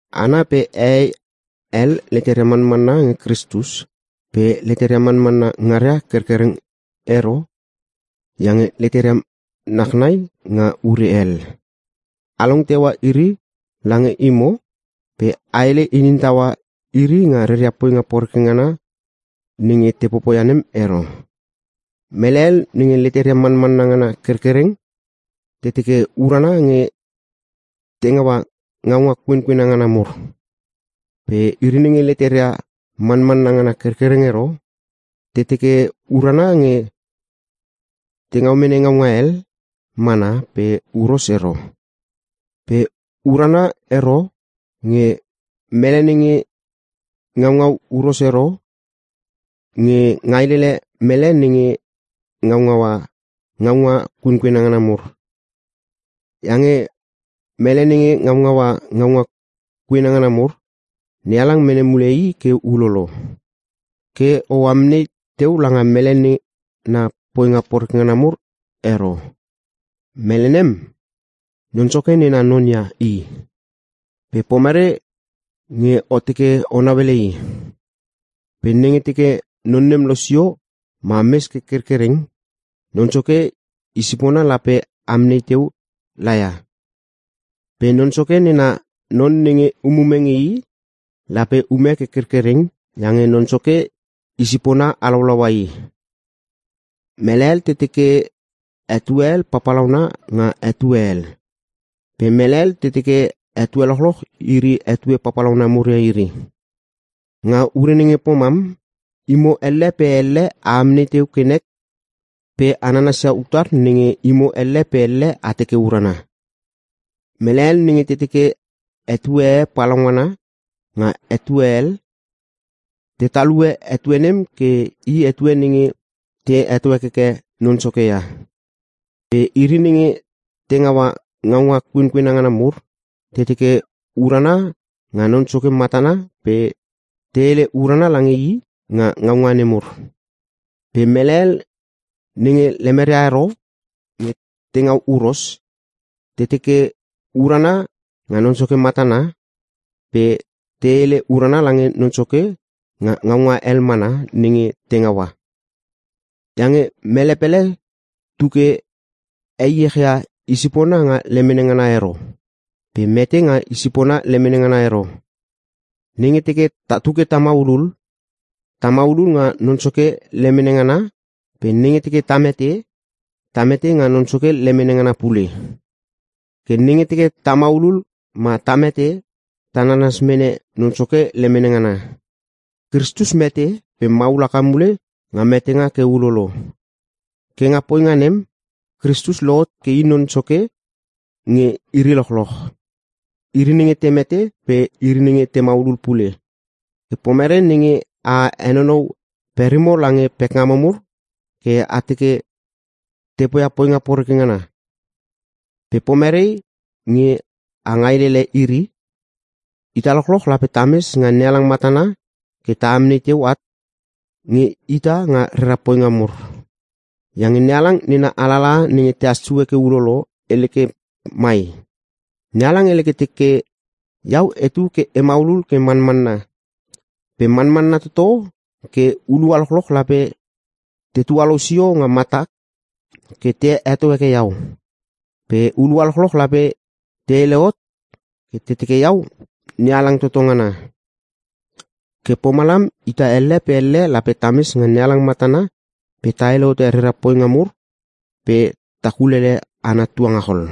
Hana pe hehei hel leteria manmanna nge Kristus pe leteria manmanna ngaria kerkereng ero iange leteria nachnai nga ure hel. A long teua iri lange imo pe a hele inin taua iri nga reria poinga nenge te poia nem ero. Mele hel nenge leteria manmanna ngana kerkereng te teke urana nge te ngaua ngaunga kuenkuena ngana mur. Pe iri nenge leteria manmanna ngana kerkereng ero, te teke urana nge te ngau mene ngaunga hel mana pe huros ero. Pe urana ero nge mele nenge ngaungau huros ero nge ngailele mele nenge ngaungaua ngaunga kuena ngana mur. Iange mele nenge ngaungaua ngaunga kuena ngana mur, NeHalang mene mule i ke ulolo. Ke o amnei teu langa mele nena poinga mur ero. Mele nem, Non Soke nena non ia i. Pe pomere nge o teke o nauele i. Pe nenge teke non nem losio ma mes ke kerkereng Non Soke i sipona lape amnei teu laia. Pe Non Soke nena non nenge umume nge i, lape ume ke kerkereng iange Non Soke i sipona halaulaua i. Mele hel te teke etue hel papalauna nga etue hel, pe mele hel te teke etue lochloch iri etue papalauna mur ia iri. Nga ure nenge pomam, imo elle pe elle amnei teu ke nek pe a nanas ia utar nenge imo elle pe elle a teke urana. Mele hel nenge te teke etue e palaungana nga etue hel, te talue etue nem ke i etue nenge te heto hekeke Non Soke ia. Pe iri nenge te ngaua ngaunga kuenkuena ngana mur, te teke urana nga Non Soke matana pe te hele urana lange i nga ngaunga nemur. Pe mele hel nenge lemeria ero nge te ngau huros, te teke urana nga Non Soke matana pe te hele urana lange Non Soke nga ngaunga hel mana nenge te ngaua. Iange mele pele tu ke heiech ia i sipona nga lemene ngana ero pe mete nga i sipona lemene ngana ero. Nenge teke tatu ke ta maulul, ta maulul nga Non Soke lemene ngana pe nenge teke ta mete, ta mete nga Non Soke lemene ngana pule. Ke nenge teke ta maulul ma ta mete, ta nanas mene Non Soke lemene ngana. Kristus mete pe maul haka mule nga metenga ke ulolo. Ke nga poinga nem, Kristus lohot ke i Non Soke nge iri lochloch. Iri nenge te mete pe iri nenge te maulul pule. Ke pomerei nenge a henonou perimo lange pekngamo mur ke a teke te poia poinga poreke ngana. Pe pomerei nge a ngailelele iri? Ita lochloch lape tames nga NeHalang matana ke amnei teu at nge ita nga rera poinga mur. Iange NeHalang nena alalaha nenge tehas sue ke ulolo, hele ke mai, “NeHalang hele ke teke, ‘Iau etu ke e maulul ke manmanna, pe manmanna toto ke hulua lochloch lape te tualou sio nga matak ke te heto heke iau; pe hulua lochloch lape te hele hot ke te teke iau NeHalang toto ngana.’” Ke pomalam, ita elle pe elle lape ta mes nga NeHalang matana pe ta hele hote rera poinga mur pe ta kulele ana tuangachol.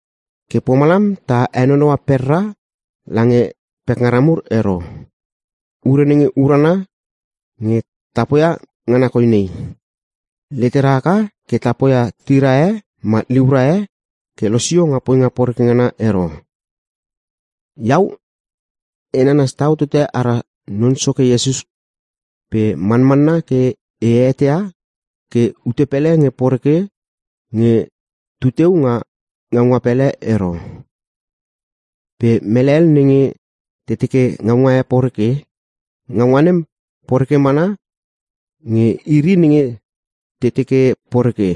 Ke pomalam ta henonou perra lange pekngara mur ero. Ure nenge urana nge ta poia ngana koi nei: Letera haka ke ta poia tira e ma liura e ke losio nga poinga poreke ngana ero. Iau e nanas tau tote ara Non Soke Iesus pe manmanna ke e eteia ke ute pele nge poreke nge tuteu nga ngaunga pele ero. Pe mele hel nenge te teke ngaunga e poreke, ngaunga nem poreke mana nge iri nenge te teke poreke.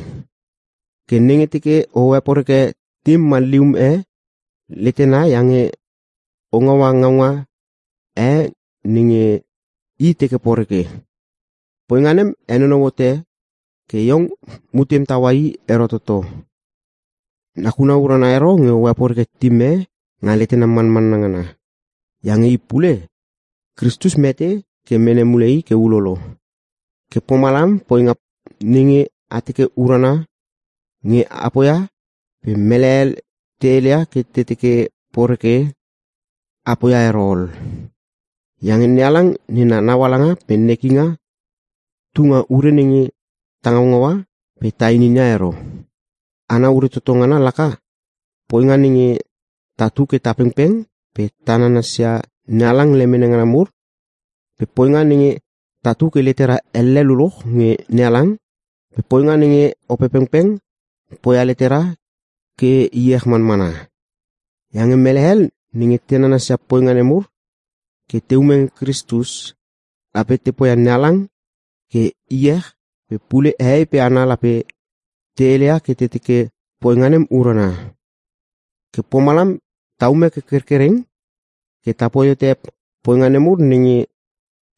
Ke nenge teke o heporeke tim ma lium e letena iange o ngaua ngaunga e nenge i teke poreke, poinga nem henonou hote ke iong mutem taua i ero toto. Nakuna urana ero nge o heporeke tim e nga letena manmanna ngana, iange i pule, Kristus mete ke mene mule i ke ulolo. Ke pomalam poinga nenge a teke urana nge a poia pe mele hel te heleia ke te teke poreke, a poia ero ol. Iange NeHalang nena naualanga pe nekinga tu nga ure nenge ta ngaungaua pe ta ininia ero. Ana ure toto ngana laka: Poinga nenge tatu ke ta pengpeng pe ta nanasia NeHalang lemene ngana mur pe poinga nenge tatu ke letera elle luluch nge NeHalang pe poinga nenge Opepengpeng poia letera ke iech manmana. Iange mele hel nenge te nanasia poinga nemur ke te ume nge Kristus, lape te poia NeHalang ke iech pe pule hehei pe hana lape te heleia ke te teke poinga nem urana. Ke pomalam ta ume ke kerkereng ke tapoi hote poinga nemur nenge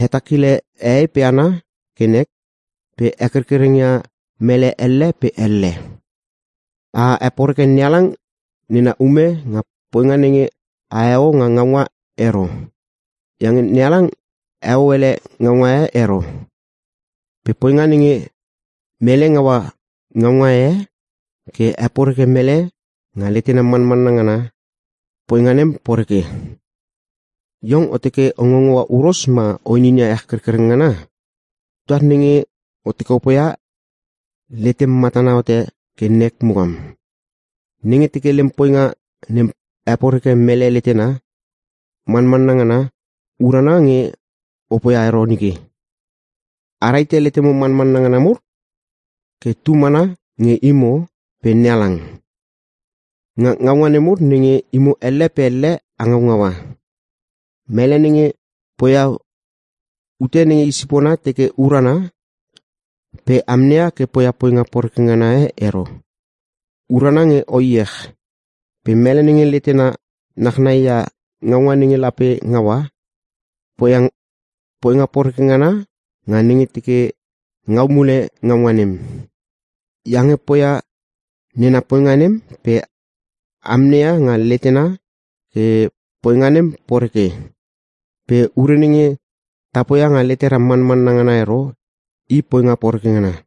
hetakile hehei pe hana ke nek pe hekerkereng ia mele elle pe elle. A heporeke NeHalang nena ume nga poinga nenge aheo nga naunga ero. Iange NeHalang heo ele ngaunga e ero. Pe poinga nenge mele ngaua ngaunga e ke he poreke mele nga letena manmanna ngana, poinga nem poreke. Iong o teke o ngaungaua huros ma o inin ia ech kerkereng ngana? Utar nenge o teke opoia letem matana hote ke nek mukam. Nenge teke lem poinga nem heporeke mele letena manmanna ngana, urana nge o poia ero nike. A rahite letemo manmanna ngana mur ke tu mana nge imo pe NeHalang, nga ngaunga nemur nenge imo elle pe elle a ngaungaua. Mele nenge poia ute nenge i sipona teke urana pe amneia ke poia poinga poreke ngana e ero, urana nge o iech. Pe mele nenge letena nachnai ia ngaunga nenge lape ngaua, poia poinga poreke ngana nga nenge teke ngau mule ngaunga nem. Iange poia nena poinga nem pe amneia nga letena ke poinga nem poreke. Pe ure nenge ta poia nga letera manmanna ngana ero, i poinga poreke ngana.